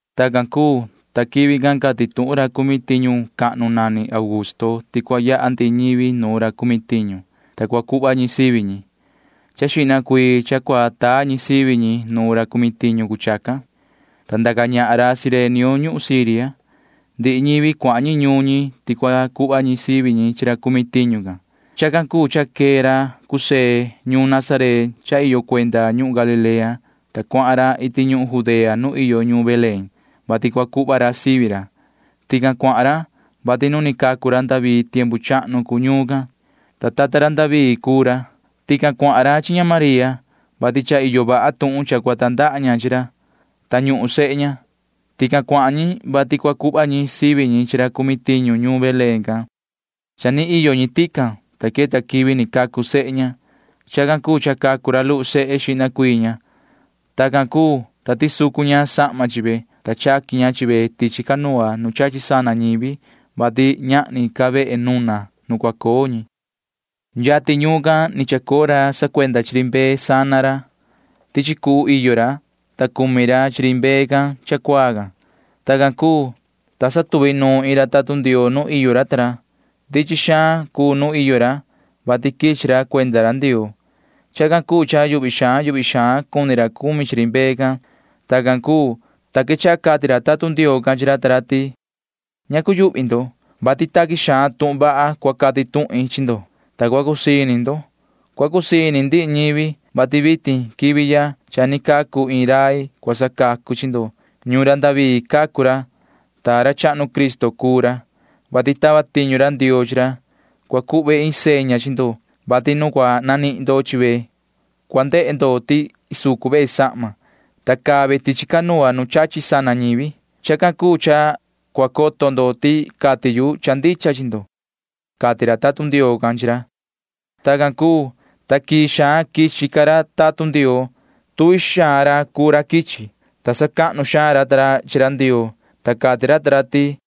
Tacan cuu, ta quivi can cati tuhun ra cumi tiñu cahnu nani Augusto ti cua yaha ndihi ñivi nu ra cumi tiñu, ta cua cuhva ñi sivi ñi. Cha ni yaha xihna cuii ñi nu ra cumi tiñu cuu chacan, ta ndaca ñahan ra Cirenio ñuhun Siria. Ndihi ñivi cuahan ñi ñuun ñi ti cua cuhva ñi sivi ñi chi ra cumi tiñu can. Chacan cuu cha quee ra José ñuun Nazaret cha iyo cuenda ñuhun Galilea, ta cuahan ra iti ñuhun Judea nu iyo ñuun Belén, [vati cua cuhva ra sivi ra]. Tican cuahan ra, vati nu ni cacu ra David tiempu chahnu cuu ñuun can, ta tata ra David cuu ra. Tican cuahan ra chi ña María, vati cha iyo vaha tuhun cha cua tandaha ña chi ra, ta ñuhun sehe ña. Tican cuahan ñi, vati cua cuhva ñi sivi ñi chi ra cumi tiñu ñuun Belén can. Cha ni iyo ñi tican, ta queta quivi ni cacu sehe ña. Chacan cuu cha cacu ra luhu sehe xihna cuii ña. Tacan cuu, ta tisucu ña sahma chi ve, ta chaqui ña chi ve tichi canoa nu chachi sana ñivi, vati ñahni ca vehe nuna nu cua coo ñi. Yatin ñuun can ni chacoo ra sacuenda chi ri mbee sana ra. Tichi cuhu iyo ra, ta cumi ra chi ri mbee can cha cuaa can. Tacan cuu, ta cha iyo iin ra tatun Ndioo nu iyo ra. Ndichin xaan cuu nuun iyo ra, vati quichi ra cuenda ra Ndioo. Chacan cuu cha yuhvi xaan yuhvi xaan cuni ra cumi chi ri mbee can. Tacan cuu, ta quechaha cati ra tatun Ndioo can chi ra ta ra ti: ―Ña cuyuhvi ndo, vati taqui xaan tuhun vaha cua cati tuhin chi ndo, ta cua cusii ini ndo. Cua cusii ini ndihi ñivi, vati vitin quivi ya cha ni cacu iin rai cua sacacu chi ndo. Ñuun David cacu ra, ta ra chahnu Cristo cuu ra, vati tava tiñu ra Ndioo chi ra. Cua cuhve iin seña chi ndo, vati nu cua nanihin ndo chi ve cua ndehe ndo ti isucu ve sahma, ta caa ve tichi canoa nu chachi sana ñivi. [Chacan cuu cha cua coto ndo ti cati yu cha ndicha chi ndo] ―cati ra tatun Ndioo can chi ra. Tacan cuu, ta quii xaan quichi ca ra tatun Ndioo chi ra. Tuvi xaan ra cuu ra quichi, ta sacahnu xaan ra ta ra chi ra Ndioo, ta cati ra ta ra ti: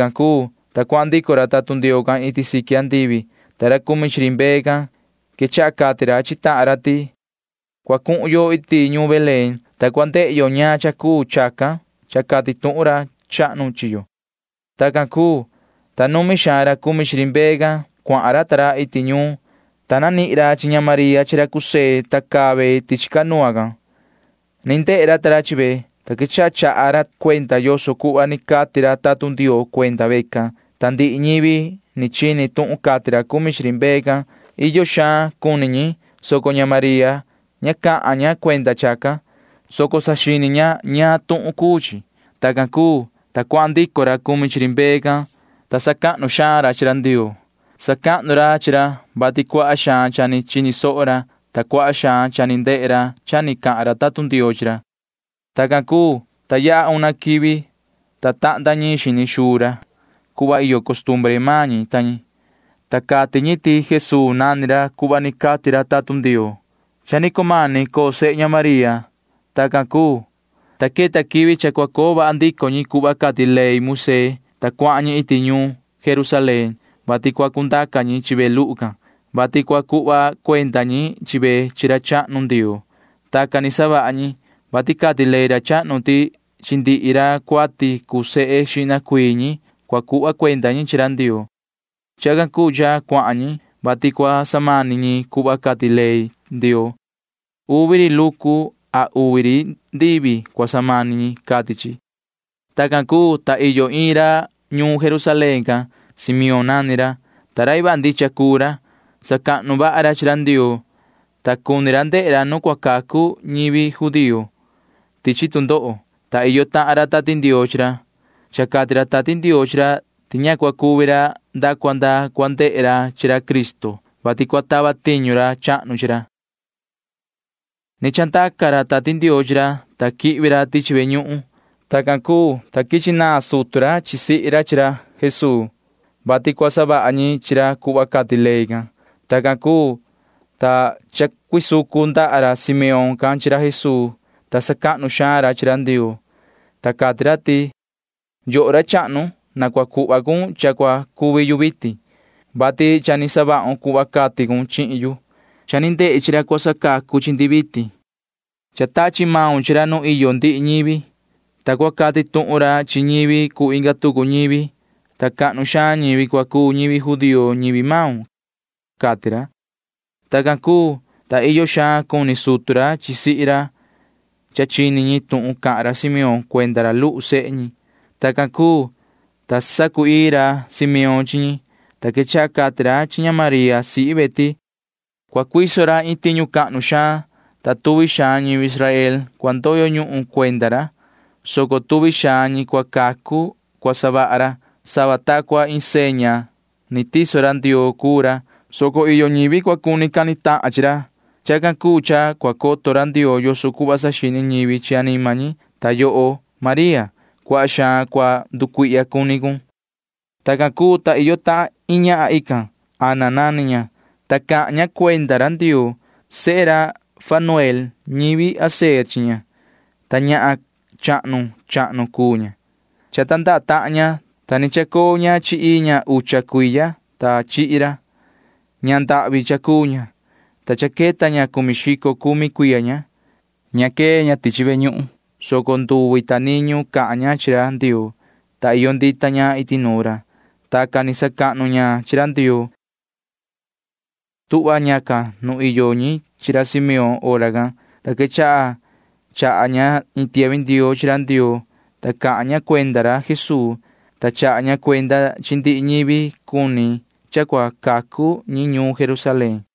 Tacan cuu, ta cuahan ndico ra tatun Ndioo can iti siqui andivi, ta ra cumi chi ri mbee can quechaha cati ra chi tahan ra ti: ―Na coho iti ñuun Belén, ta na cua ndehe yo ñaan cha cuu chacan cha cati tuhun ra chahnu chi yo ―cati ra ta ra. Tacan cuu, ta numi xaan ra cuahan ra cumi chi ri mbee ta ra iti ñuun. Cuahan ra, ta nanihin ra chi ña María chi ra José, ta caa ve tichi canoa can. Ni ndehe ra ta ra chi ve, ta quechaha chaha ra cuenda yoso cuhva ni cati ra tatun Ndioo cuenda vecan. Ta ndihi ñivi ni chini tuhun cati ra cumi chi ri mbee can―iyo xaan cuni ñi, soco ña María ña cahan ña cuenda chacan, soco saxini ña ñaan tuhun cuu chi. Tacan cuu, ta cuahan ndico ra cumi chi ri mbee can, ta sacahnu xaan ra chi ra Ndioo. Sacahnu ra chi ra, vati cuaha xaan cha ni chini soho ra, ta cuaha xaan cha ni ndehe ra cha ni cahan ra tatun Ndioo chi ra. Tacan cuu, ta yaha una quivi, ta tahnda ñiin xini xuu ra, [cuhva iyo costumbre maan ñi ta ñi,] ta cati ñi ti Jesuu nani ra cuhva ni cati tatun Ndioo, ta ni cumani coo sehe ña María. Tacan cuu, ta queta quivi cha cua coo vaha ndico ñi cuhva cati ley Moisee, ta cuahan ñi iti ñuun Jerusalén. Cuahan ñi, vati cua cundaca ñi chi ve luhu can, vati cua cuhva cuenda ñi chi ve chi ra chahnu Ndioo. Tacan ni savaha ñi, vati cati ley ra chahnu ti chi ndihi ra cuati cuu sehe xihna cuii ñi cua cuhva cuenda ñi chi ra Ndioo. Chacan cuu cha cuahan ñi, vati cua samani ñi cuhva cati ley Ndioo. Uvi ri lucu a uvi ri ndivi cua samani ñi, cati chi. Tacan cuu, ta iyo iin ra ñuun Jerusalén can. Simeón nani ra, ta rai vaha ndicha cuu ra. Sacahnu vaha ra chi ra Ndioo, ta cuni ra ndehe ra nu cua cacu ñivi judío chi tu ndoho, ta iyo tahan ra Tati Ndioo chi ra. Cha cati ra Tati Ndioo chi ra ti ña cua cuvi ra nda cua nda cua ndehe xihna ra chi ra Cristo, vati cua tava tiñu ra chahnu chi ra. Ni chandaca ra Tati Ndioo chi ra, ta quihvi ra tichi ve ñuhun. Tacan cuu, ta quichi naan sutu ra sihi ra chi ra Jesuu, vati cua savaha ñi chi ra cuhva cati ley can. Tacan cuu, ta chacuisucu ndaha ra Simeón can chi ra Jesuu, ta cahan vaha xaan ra chi ra Ndioo, ta cati ra ti: Yoho ra chahnu, na cua cuhva cun cha cua cuvi yu vitin, vati cha ni savahun cuhva cati cun chihin yu. Cha ni ndehi chi ra cua sacacu chi ndi vitin. Cha tachi maun chi ra nu iyo ndihi ñivi, ta cua cati tuhun ra chi ñivi cuu inga tucu ñivi, ta cahnu xaan ñivi cua cuu ñivi judío ñivi maun cua savaha ra ―cati ra. Tacan cuu, ta iyo xaan cuni sutu ra sihi ra cha chini ñi tuhun cahan ra Simeón cuenda ra luhu sehe ñi. Tacan cuu, ta sacu‑ii ra Simeón chi ñi, ta quechaha cati ra chi ña María sihi ve ti: ―Cua cuiso ra iin tiñu cahnu xaan, ta cuaha ñivi Israel cua ndoyo ñuhun cuenda ra, soco cuaha ñi cua cacu cua savaha ra. Sava ta cua iin seña ni tiso ra Ndioo cuu ra, soco iyo ñivi cua cuni cani tahan ñi chi ra. Chacan cuu cha cua coto ra Ndioo yoso cuhva saxini ñivi chi anima ñi. Ta yoho María, cuaha xaan cua nducuihya cuni cun ―cati ra. Tacan cuu, ta iyo tahan iin ñahan tican. Ana nani ña, ta cahan ña cuenda ra Ndioo. Sehe ra Fanuel ñivi Aser chi ña, ta ñahan chahnu chahnu cuu ña. Cha tandaha tahan ña, ta ni chacoo ña chi ii ña ucha cuiya, ta chihi ra. Ñahan ndahvi cha cuu ña, ta cha queta ña cumi xico cumi cuiya ña. Ña quee ña tichi ve ñuhun, soco nduvi ta niñu cahan ña chi ra Ndioo, ta iyo ndita ña iti nuun ra. Tacan ni sacahnu ña chi ra Ndioo. Tuhva ñacan nu iyo ñi chi ra Simeón hora can, ta quechaha chaha ña iin tiahvi ndioo chi ra Ndioo, ta cahan ña cuenda ra Jesuu, ta chaha ña cuenda chi ndihi ñivi cuni cha cua cacu ñi ñuun Jerusalén.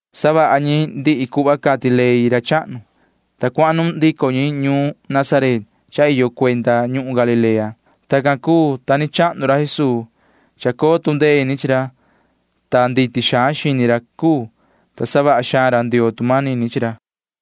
Savaha ñi ndihi cuhva cati ley ra chahnu, ta cuanuhun ndico ñi ñuun Nazaret cha iyo cuenda ñuhun Galilea. Tacan cuu, ta ni chahnu ra Jesuu. Chacoo tu ndee ini chi ra, ta nditi xaan xini ra cuu, ta savaha xaan ra Ndioo tu manini chi ra.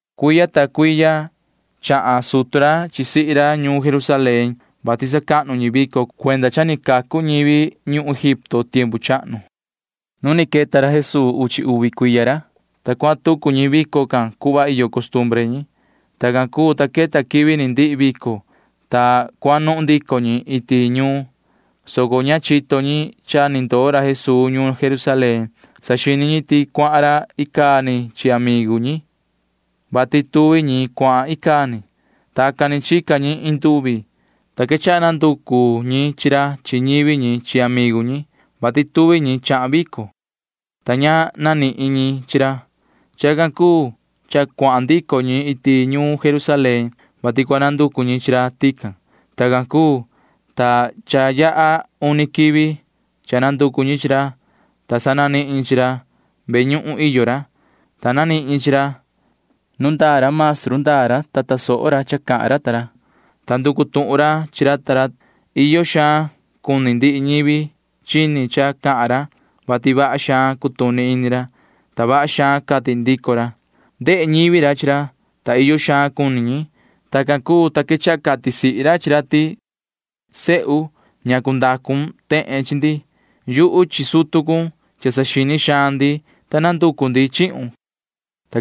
Cuiya ta cuiya chahan sutu ra chi sihi ra ñuun Jerusalén, vati sacahnu ñi vico cuenda cha ni cacu ñivi ñi ñuhun Egipto tiempu chahnu. Nu ni queta ra Jesuu uchi uvi cuiya ra, ta cuahan tucu ñi vico can cuhva iyo costumbre ñi. Tacan cuu, ta queta quivi ni ndihi vico, ta cuanuhun ndico ñi iti ñuun, soco ña chito ñi cha ni ndoo ra Jesuu ñuun Jerusalén. Saxini ñi ti icaa ni cuahan ra chi amigu ñi, vati tuvi ñi cuahan icaa ni. Tacan ni chica ñi iin nduvi, ta quechaha nanducu ñi chi ra chi ñivi ñi chi amigu ñi, vati tuvi ñi chahan vico, ta ña nanihin ñi chi ra. Chacan cuu cha cuahan ndico ñi iti ñuun Jerusalén, vati cua nanducu ñi chi ra tican. Tacan cuu, ta cha yaha uni quivi cha nanducu ñi chi ra, ta sa nanihin ñi chi ra. Ve ñuhun iyo ra, ta nanihin ñi chi ra. Nu ndaa ra maestru ndaa ra, ta tasoho ra cha cahan ra maestru ta ra, ta nducu tuhun ra chi ra ta ra. Iyo xaan cuni ndihi ñivi chini cha cahan ra, vati vaha xaan cutuni ini ra, ta vaha xaan cati ndico ra. Ndehe ñivi ra chi ra, ta iyo xaan cuni ñi. Tacan cuu, ta quechaha cati sihi ra chi ra ti: ―Sehu, ¿ñacu ndacu cun tehen chi ndi? Yuhu chi sutu cun―cha saxini xaan ndi, ta nanducu ndi chihun ―cati ña.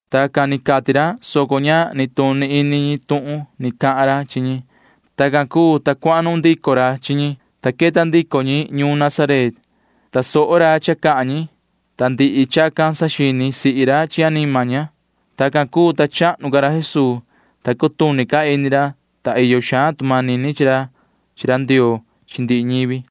Tacan ni cati ra, soco ña nituni ini ñi tuhun ni cahan ra chi ñi. Tacan cuu, ta cuanuhun ndico ra chi ñi, ta queta ndico ñi ñuun Nazaret. Tasoho ra cha cahan ñi, ta ndihi chacan saxini sihi ra chi anima ña. Tacan cuu, ta chahnu ca ra Jesuu, ta cutuni ca ini ra, ta iyo xaan tu manini chi ra chi ra Ndioo chi ndihi ñivi.